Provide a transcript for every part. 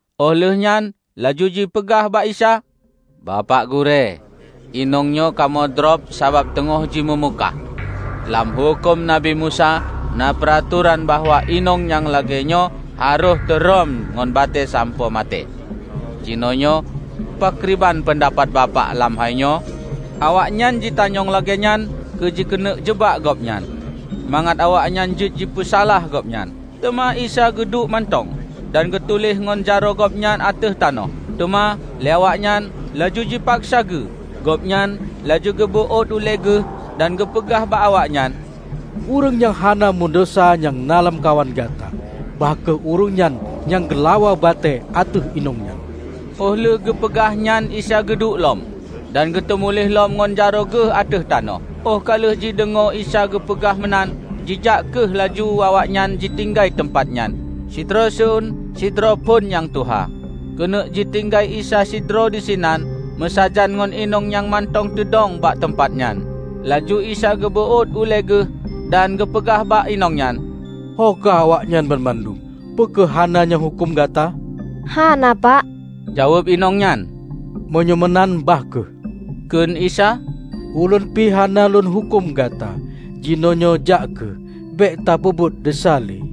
óh lheueh nyan laju jipeugah bak Isa, "Bapak Gurée, inong nyoe kamoe drob sabab teungoh jimeumukah. Lam Huköm Nabi Musa na peuratoran bahwa inong nyang lagée nyoe harôh teurhom ngon batée sampoe maté. Jinoenyoe pakriban peundapat Bapak lam hainyoe?" Awaknyan jitanyong lagée nyan keu jikeuneuk jeubak Gobnyan, mangat awaknyan jeuet jipeusalah Gobnyan. Teuma Isa geuduek mantong, dan geutuléh ngon jaroe Gobnyan ateueh tanoh. Teuma lé awaknyan laju jipaksa geu, Gobnyan laju geubeuôt ulée Geuh dan geupeugah bak awaknyan, "Ureuëng nyang hana meudesya nyang na lamkawan gata, bah kheueh ureuëng nyan nyang geulawa batée ateueh inong nyan." Óh lheueh geupeugah nyan Isa geuduek lom, dan geutumuléh lom ngon jaroe Geuh ateueh tanoh. Óh ka lheueh jideungoe Isa geupeugah meunan, jijak kheueh laju awaknyan jitinggai teumpat nyan, sidroe seun sidroe phon nyang tuha. Keuneuk jitinggai Isa sidroe disinan meusajan ngon inong nyang mantong teudong bak teumpat jih. Laju Isa geubeuôt ulée geuh dan geupeugah bak inong nyan, "Ho ka awaknyan banmandum? Peu kheueh hana nyang huköm gata?" "Hana Pak," jaweueb inong nyan. "Meunyoe meunan bah kheueh," kheun Isa, "Ulôn pi hana lôn huköm gata. Jinoenyoe jak kheueh, bék tapeubuet desya le."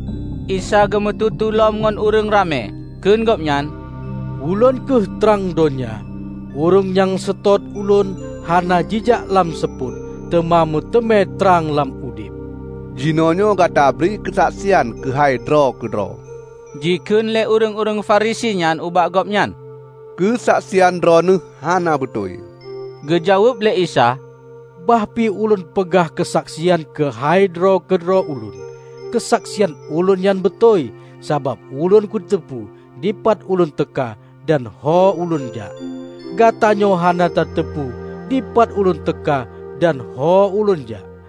Isa geumeututoe lom ngon ureuëng ramé, kheun gobnyan, "Ulôn kheueh trang donya. Ureuëng nyang seutôt Ulôn hana jijak lam seupôt, teuma meuteumé trang lam udeb." "Jinoenyoe Gata tabri keusaksian keuhai droe keudroe," jikheun lé ureuëng-ureuëng Farisi nyan ubak Gobnyan, "Keusaksian droeneueh hana beutôi." Geujaweueb lé Isa, "Bah pi Ulôn peugah keusaksian keuhai droe keudroe Ulôn, keusaksian Ulôn nyan beutôi; sabab Ulôn kuteupeu dipat Ulôn teuka dan ho Ulôn jak. Gatanyoe hana tateupeue dipat Ulôn teuka dan ho Ulôn jak.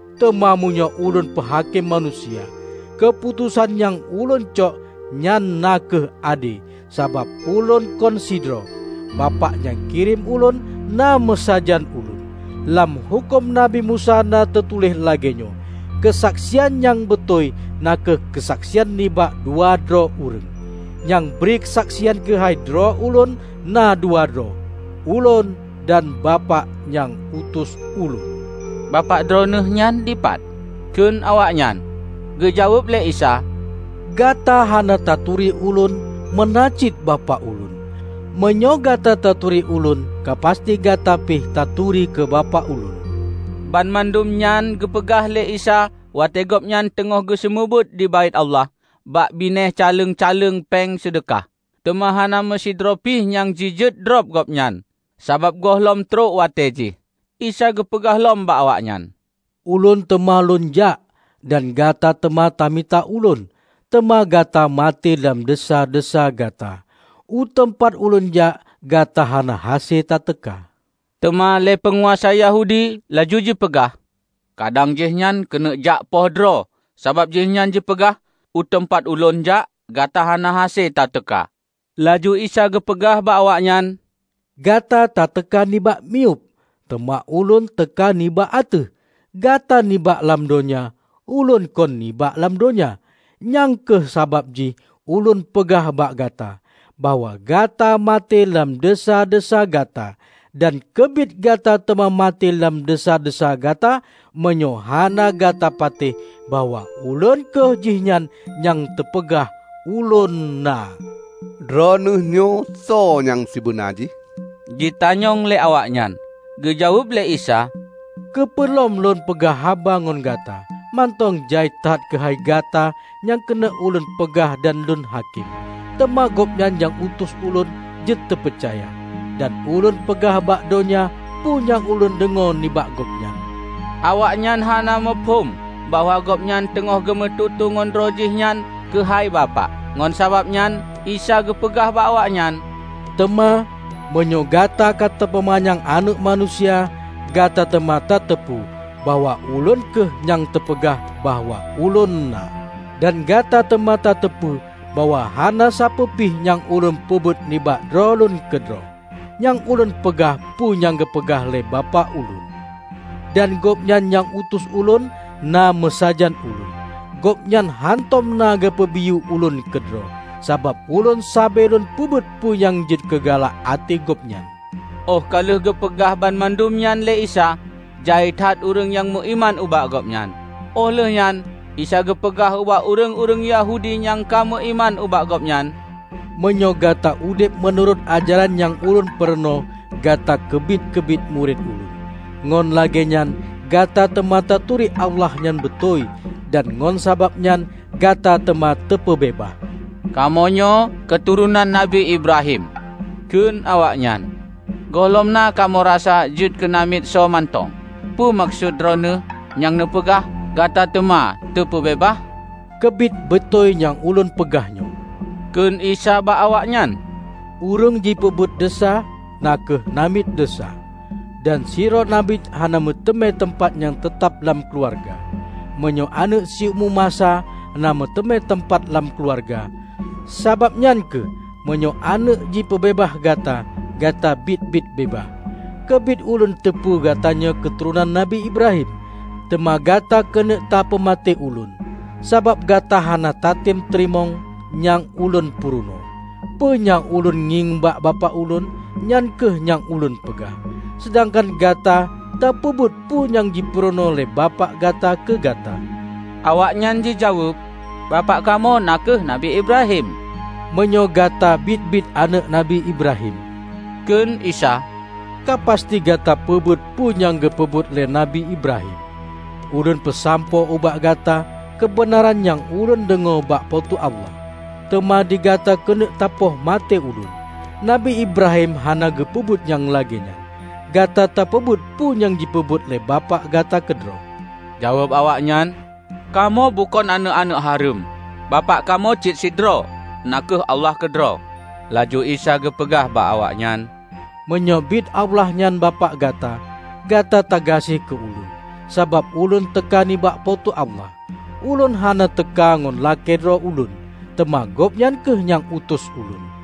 Teuma meunyoe Ulôn peuhakém manusia, keuputosan nyang Ulôn cok nyan na kheueh ade, sabab Ulôn kon sidroe; Bapak nyang kirém Ulôn na meusajan Ulôn. Lam Huköm Nabi Musa na teutuléh lagée nyoe: keusaksian nyang beutôi na kheueh keusaksian nibak dua droe ureuëng. Nyang bri keusaksian keuhai droe Ulôn na dua droe -- Ulôn dan Bapak nyang utus Ulôn." "Bapak droeneueh nyan dipat?" kheun awaknyan. Geujaweueb lé Isa, "Gata hana taturi Ulôn meunan cit Bapak Ulôn. Meunyoe gata taturi Ulôn, ka pasti gata pih ta turi keu Bapak Ulôn." Banmandum nyan geupeugah lé Isa watée Gobnyan teungoh geuseumeubeuet di Baét Allah bak binéh caleng-caleng péng seudeukah. Teuma hana meusidroe pi nyang jijeuet drob Gobnyan sabab gohlom trok watée jih. Isa geupeugah lom bak awaknyan, "Ulôn teuma Lôn jak, dan gata teuma tamita Ulôn, teuma gata maté lam desya-desya gata. U teumpat Ulôn jak, gata hana hase tateuka." Teuma lé peunguasa Yahudi laju jipeugah, "Kadang Jihnyan keuneuk jak poh droe, sabab Jihnyan jipeugah, 'U teumpat Ulôn jak, gata hana hase ta teuka.' " Laju Isa geupeugah bak awaknyan, "Gata tateuka nibak miyueb; teuma Ulôn teuka nibak ateueh. Gata nibak lam donya; Ulôn kon nibak lam donya. Nyang kheueh sabab jih Ulôn peugah bak gata, bahwa gata maté lam desya-desya gata. Dan keubiet gata teuma maté lam desya-desya gata, meunyoe hana gata patéh bahwa 'Ulôn kheueh Jihnyan nyang teupeugah ULÔN NA'." "Droeneueh nyoe soe nyang sibeuna jih?" jitanyong lé awaknyan. Geujaweueb lé Isa, "Keupeue lom Lôn peugah haba ngon gata! Mantong jai that keuhai gata nyang keuneuk Ulôn peugah dan Lôn hakém. Teuma Gobnyan nyang utus Ulôn jeuet teupeucaya. Dan Ulôn peugah bak donya peue nyang Ulôn deungoe nibak Gobnyan." Awaknyan hana muphom bahwa Gobnyan teungoh geumeututoe ngon droe Jih nyan keuhai Bapak. Ngon sabab nyan Isa geupeugah bak awaknyan, "Teuma, meunyoe gata ka tapeumanyang Aneuëk Manusia, gata teuma ta teupeu bahwa 'Ulôn kheueh nyang teupeugah bahwa ULÔN NA', dan gata teuma ta teupeu bahwa hana sapeue pih nyang Ulôn peubuet nibak droe Lôn keudroe. Nyang Ulôn peugah peue nyang geupeugah lé Bapak ubak Ulôn. Dan Gobnyan nyang utus Ulôn na meusajan Ulôn. Gobnyan hántom na geupeubiyeu Ulôn keudroe, sabab Ulôn sabe Lôn peubuet peue nyang jeuet keu galak até Gobnyan." Óh ka lheueh geupeugah banmandum nyan lé Isa, jai that ureuëng nyang meuiman ubak Gobnyan. Óh lheueh nyan Isa geupeugah ubak ureuëng-ureuëng Yahudi nyang ka meuiman ubak Gobnyan, "Meunyoe gata udeb meunurot ajaran nyang Ulôn peurunoe gata keubiet-keubiet murit Ulôn, ngon lagée nyan gata teuma taturi Allah nyang beutôi, dan ngon sabab nyan gata teuma teupeubeubaih." "Kamoenyoe keuturonan Nabi Ibrahim," kheun awaknyan. "Gohlom na kamoe rasa jeuet keunamiet soe mantong! Peue meukeusut Droeneueh nyang neupeugah, 'Gata teuma teupeubeubaih'?" "Keubiet beutôi nyang Ulôn peugah nyoe," kheun Isa bak awaknyan. "Ureuëng jipeubuet desya, na kheueh namiet desya. Dan sidroe namiet hana meuteumé teumpat nyang teutab lam keuluwarga, meunyoe aneuëk siumu masa na meuteumé teumpat lam keuluwarga. Sabab nyan kheueh, meunyoe aneuëk jipeubeubaih gata, gata biet-biet beubaih. Keubiet Ulôn teupeue gatanyoe keuturonan Nabi Ibrahim. Teuma gata keuneuk tapeumaté Ulôn, sabab gata hana tatem teurimong nyang Ulôn purunoe. Peue nyang Ulôn ngieng bak Bapak Ulôn, nyan kheueh nyang Ulôn peugah. Seudangkan gata tapeubuet peue nyang jipeurunoe lé bapak gata keu gata." Awaknyan jijaweueb, "Bapak kamoe na kheueh Nabi Ibrahim." "Meunyoe gata biet-biet aneuëk Nabi Ibrahim," kheun Isa, "Ka pasti gata peubuet peue nyang geupeubuet lé Nabi Ibrahim. Ulôn peusampoe ubak gata keubeunaran nyang Ulôn deungoe bak Po teu Allah, teuma digata keuneuk tapoh maté Ulôn. Nabi Ibrahim hana geupeubuet nyang lagée nyan! Gata tapeubuet peue nyang jipeubuet lé bapak gata keudroe." Jaweueb awaknyan, "Kamoe bukon aneuëk-aneuëk hareuem. Bapak kamoe cit sidroe, na kheueh Allah keudroe." Laju Isa geupeugah bak awaknyan, "Meunyoe bit Allah nyan Bapak gata, gata tagaséh keu Ulôn, sabab Ulôn teuka nibak Po teu Allah. Ulôn hana teuka ngon lakée droe Ulôn, teuma Gobnyan kheueh nyang utus Ulôn.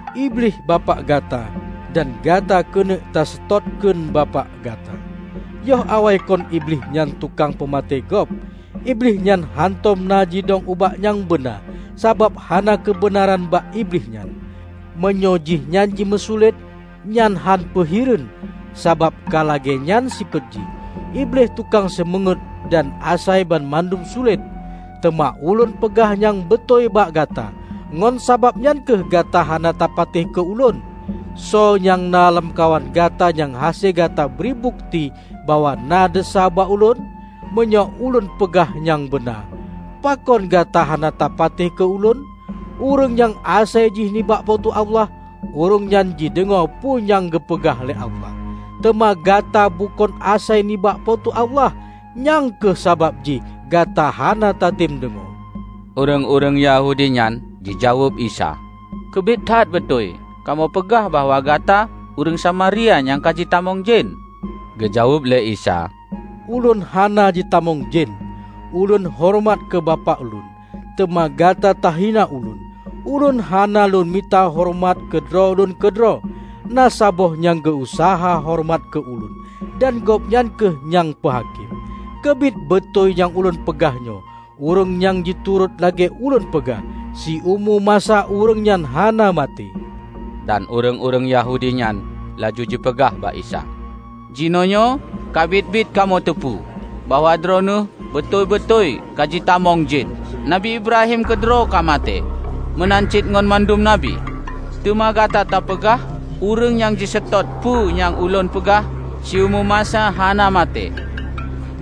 Iblih bapak gata, dan gata keuneuk taseutôt kheun bapak gata. Yoh awaikon Iblih nyan tukang peumaté gob. Iblih nyan hántom na jidong ubak nyang beuna, sabab hana keubeunaran bak Iblih nyan. Meunyoe Jihnyan jimeusulet, nyan hánpeu hireuen, sabab ka lagée nyan sifeuet jih. Iblih tukang seumeungét dan asai banmandum sulet. Teuma Ulôn peugah nyang beutôi bak gata, ngon sabab nyan kheueh gata hana tapatéh keu Ulôn. Soe nyang na lamkawan gata nyang hase gata bri bukeuti bahwa na desya bak Ulôn? Meunyoe Ulôn peugah nyang beuna, pakon gata hana tapatéh keu Ulôn? Ureuëng nyang asai jih nibak Po teu Allah, ureuëng nyan jideungoe peue nyang geupeugah lé Allah. Teuma gata bukon asai nibak Po teu Allah, nyang kheueh sabab jih gata hana tatem deungoe." Ureuëng-ureuëng Yahudi nyan jijaweueb Isa, "Keubiet that beutôi kamoe peugah bahwa gata ureuëng Samaria nyang ka jitamong jén?" Geujaweueb lé Isa, "Ulôn hana jitamong jen. Ulôn horeumat keu Bapak Lôn, teuma gata tahina Ulôn. Ulôn hana Lôn mita horeumat keu droe Lôn keudroe. Na saboh nyang geu-useuha horeumat keu Ulôn, dan Gobnyan kheueh nyang peuhakém. Keubiet beutôi nyang Ulôn peugah nyoe, ureuëng nyang jiturot lagée Ulôn peugah, siumu masa ureuëng nyan hana maté." Dan ureuëng-ureuëng Yahudi nyan laju jipeugah bak Isa, "Jinoenyoe ka biet-biet kamoe teupeu bahwa Droeneueh beutôi-beutôi ka jitamong jen! Nabi Ibrahim keudroe ka maté, meunan cit ngon mandum Nabi. Teuma gata tapeugah, 'Ureuëng nyang jiseutôt peue nyang Ulôn peugah, siumu masa hana maté.'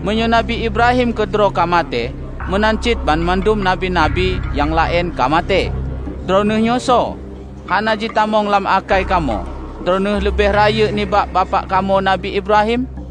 Meunyoe Nabi Ibrahim keudroe ka maté, meunan cit banmandum Nabi-nabi nyang laén ka maté, droeneueh nyoe soe? Hana jitamong lam akai kamoe Droeneueh leubeh rayeuk nibak bapak kamoe Nabi Ibrahim!"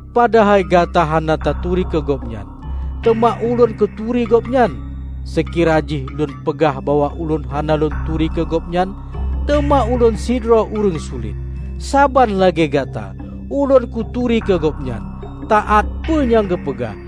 padahai gata hana taturi keu Gobnyan. Teuma Ulôn kuturi Gobnyan. Seukira jih Ulôn peugah bahwa Ulôn hana Lôn turi keu Gobnyan, teuma Ulôn sidroe ureuëng sulet, saban lagée gata. Ulôn kuturi keu Gobnyan, taát peue nyang geupeugah.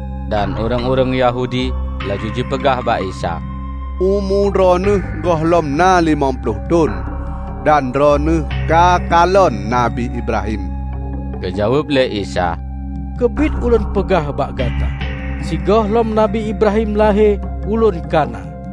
Dan ureuëng-ureuëng Yahudi laju jipeugah bak Isa, "Umu Droeneueh gohlom na limong ploh thon, dan droeneueh ka kalon Nabi Ibrahim?" Geujaweueb lé Isa, "Keubiet Ulôn peugah bak gata: sigohlom Nabi Ibrahim lahé, Ulôn ka na."